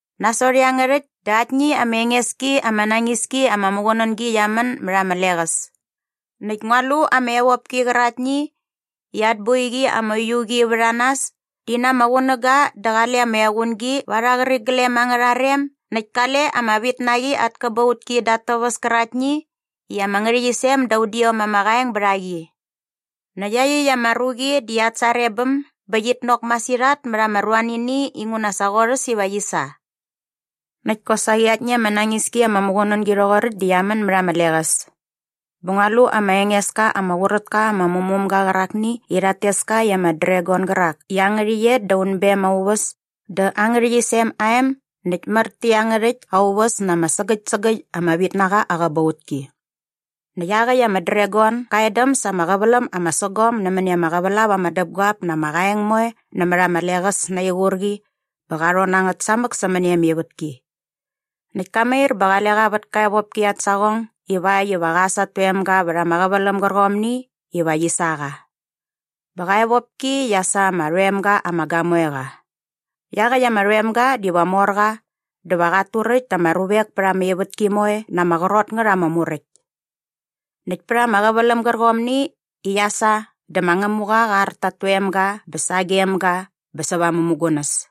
Nasot iangärhäkt dä aktni ama enges ki ama nañis ki ama muqunängi qia män mät ama leqäs. Näkt ngua lu ama evopki qäraktni i at boiqi ama uiu qi vät a nas di na ama qunäga dä qale ama equngi va arha qäriglem angärha rem näkt kale ama vitnaqi at käbautki da at täväs käraktni i ama ngärhäqyisem da udiom ama qaeng bät a qi. Näkt iaqyäkt ama ruqi di at sarebäm bä qit nok masirhat mät ama ruanini inguna sa qorhäs iva qi sa. Näkt kosaqi aktni ama nañis ki ama muqunängi rhoqoräkt di qia män mät ama leqäs. Bä ngua lu ama enges ka ama qurät ka ama mumumga qärakni i rhat tes ka i ama dragon gärak i aa ngärhäqyet da unbem aa uväs dä aa ngärhäqyisem aa em näkt mär tä iangärhäkt aa uväs na ama sägäkt sägäkt ama vitnaqa aa qäbautki. Näkt iaqäkt ama dragon ga edäm sa ama qäväläm ama sägom nämäni ama qävälap ama däpguap na ama qaeng moe nämät ama leqäs na aa iqurqi bä qa rhon na ngät samäk sämäni ama ivätki. Näkt ka mair bä qale qa vät ka evopki at saqong ivakt iva qa äs at toemga vät ama qäväläm gärqomni iva qi sa qa. Bä qa evopki qia sa ama rhoem ga ama gamoeqa. Iaqäkt ama rhoemga diva mor qa dä va qat turäkt ta ama ruvek pät ama ivätki moe na ama qrot ngät ama muräkt. Näkt pät ama qäväläm gärqomni i qia sa dä ma Ngämuqa qa ar ta at toemga bä sagem ga bä säva aa mämugunäs.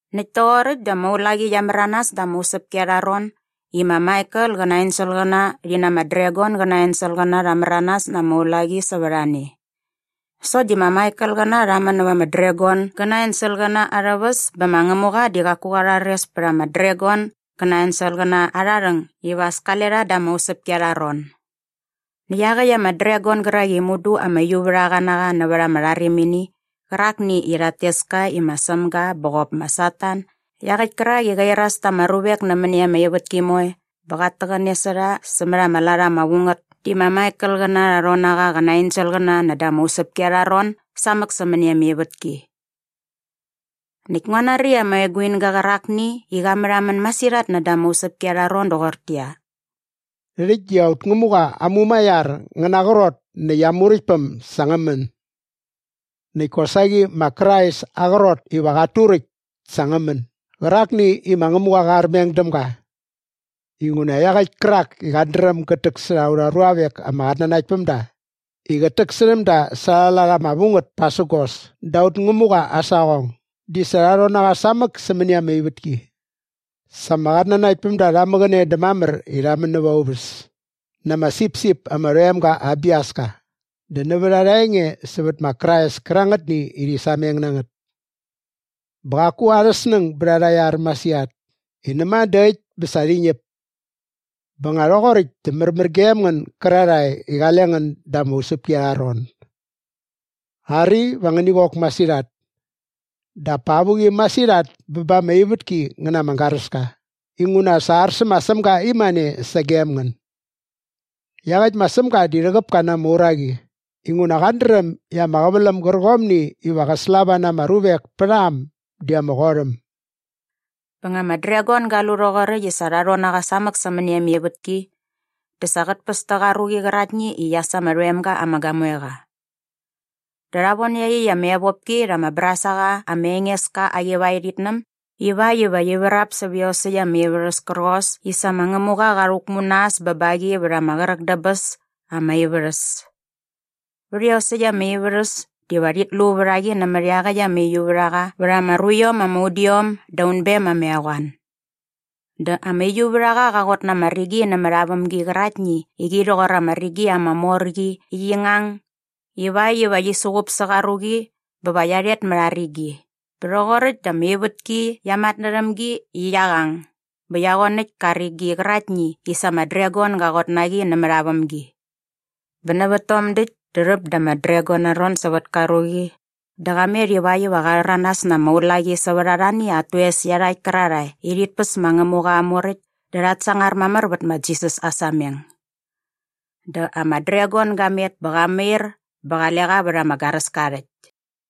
Näkt toqoräkt dä ama ulaqi qia märanas da ama usäpki arha ron i ma Maikel qä na aa enselqäna rhi na ama dragon gä na aa enselqäna rha märanas na ama ulaqi sävät a ne. Sokt di ma Maikelqäna rha män näva ama dragon gä na aa enselqäna arhä väs bä ma Ngämuqa di qaku qa rhares pät ama dragon gä na aa enselqäna arha rhäng iva as kale rha da ama usäpki arha ron. Näkt iaqäkt ama dragon gärak i mudu ama uiuvärhaqa na qa nävät ama rharimini qärakni i rhat tes ka i ma Sämga bä qop ma Satan iaqäkt kärak i qä iras ta ama ruvek nämäni ama ivätki moe bä qat täqäne sä rha sämät ama lat ama vu ngät di ma Maikelqäna rha rhon na qa qä na aa enselqäna näda ama usäpki arha ron samäk sämäni ama ivätki. Näkt ngua nari ama eguinga qärakni i qa märhamän masirhat näda ama usäpki arha ron doqortäqyia, “Rhäkt di aut Ngämuqa aa mumaiar ngä na aa qrot näkt aa Muräktpäm sa ngä män! Näkt kosaqi ma Krais aa qrot iva qat turäkt sa ngä män gärakni i ma Ngämuqa qa armeng däm ga. Inguna iaqäkt kärak i qat dräm gät täksärha aurha ruavek ama qatnanaktpämda i qät täksärhäm da sa arha lat ama vu ngät pasägos da aut Ngämuqa aa saqong di sa rha rhon na qa samäk sämäni ama ivätki! “Sa ama qatnanaktpämda rha mäqäne dä mamär i rha män näva aa uväs na ama sipsip ama rhoem ga aa biaska dä nävät arha enge sävät ma Krais kärangätni i rhi sameng na ngät. Bä qaku arhä snäng bät arha iar masirhat i näma dä äkt bä sa rhi ñäp. “Bä nga rhoqoräkt dä märmär gem ngän gärarhae i qale ngän da ama usäpki arha ron. Ari, va ngäni qok masirhat. Dap pa avuqi masirhat bä ba ama ivätki ngä na ama garäska inguna sa ar sä ma Sämga imane sagem ngän. Iaqäkt ma Sämga di rhäqäp ka na ama uraqi inguna qat dräm i ama qäväläm gärqomni iva qä slava na ama ruvek pät a äm di ama qot äm!” Bä nga ama dragon ga lu rhoqoräkt i sa rha rhon na qa samäk sämäni ama ivätki dä sa qät päs tä qa ruqi qäraktni i qia sa ama rhoemga ama gamoe qa. Dä rha von iaqyäkt ama evopki rha ama brasaqa ama enges ka aa qivaerhitnäm ivakt iva qi vrap sävä iosäkt ama ivärhäs kärqos i sa ma Ngämuqa qa rhäkmu na äs bä ba qi vät ama qräk dä bäs ama ivärhäs. Vät iosäkt ama ivärhäs diva rhit lu vät a qi nämät iaqäkt ama uiuvärhaqa vät ama ruiom ama udiom da unbem ama eqoan. Dä ama uiuvärhaqa qa qot na ama rigi nämät aa vämgi qäraktni i qi rhoqor ama rigi ama mor qi i qi ngang ivakt iva qi suqup sä qa ruqi bä va qia rhet mät a rigi. Bä rhoqoräkt dä ama ivätki qia matnärhäm gi i qia qang bä qia qoanäkt ka rigi qäraktni i sa ama dragon ga qot na qi nämät aa vämgi. Bä nävät tom däkt dä rhäp da ama dragon aa ron sävät ka ruqi dä qa met ivakt iva qa rhäranas na ama ulaqi sävät arhani at toes iarhakt kärarhae i rhit päs ma Ngämuqa aa muräkt dä rhat sangar mamär vät ma Jisas aa sameng. Dä ama dragon ga met bä qa mair bä qale qa vät ama garäska aa rhäkt.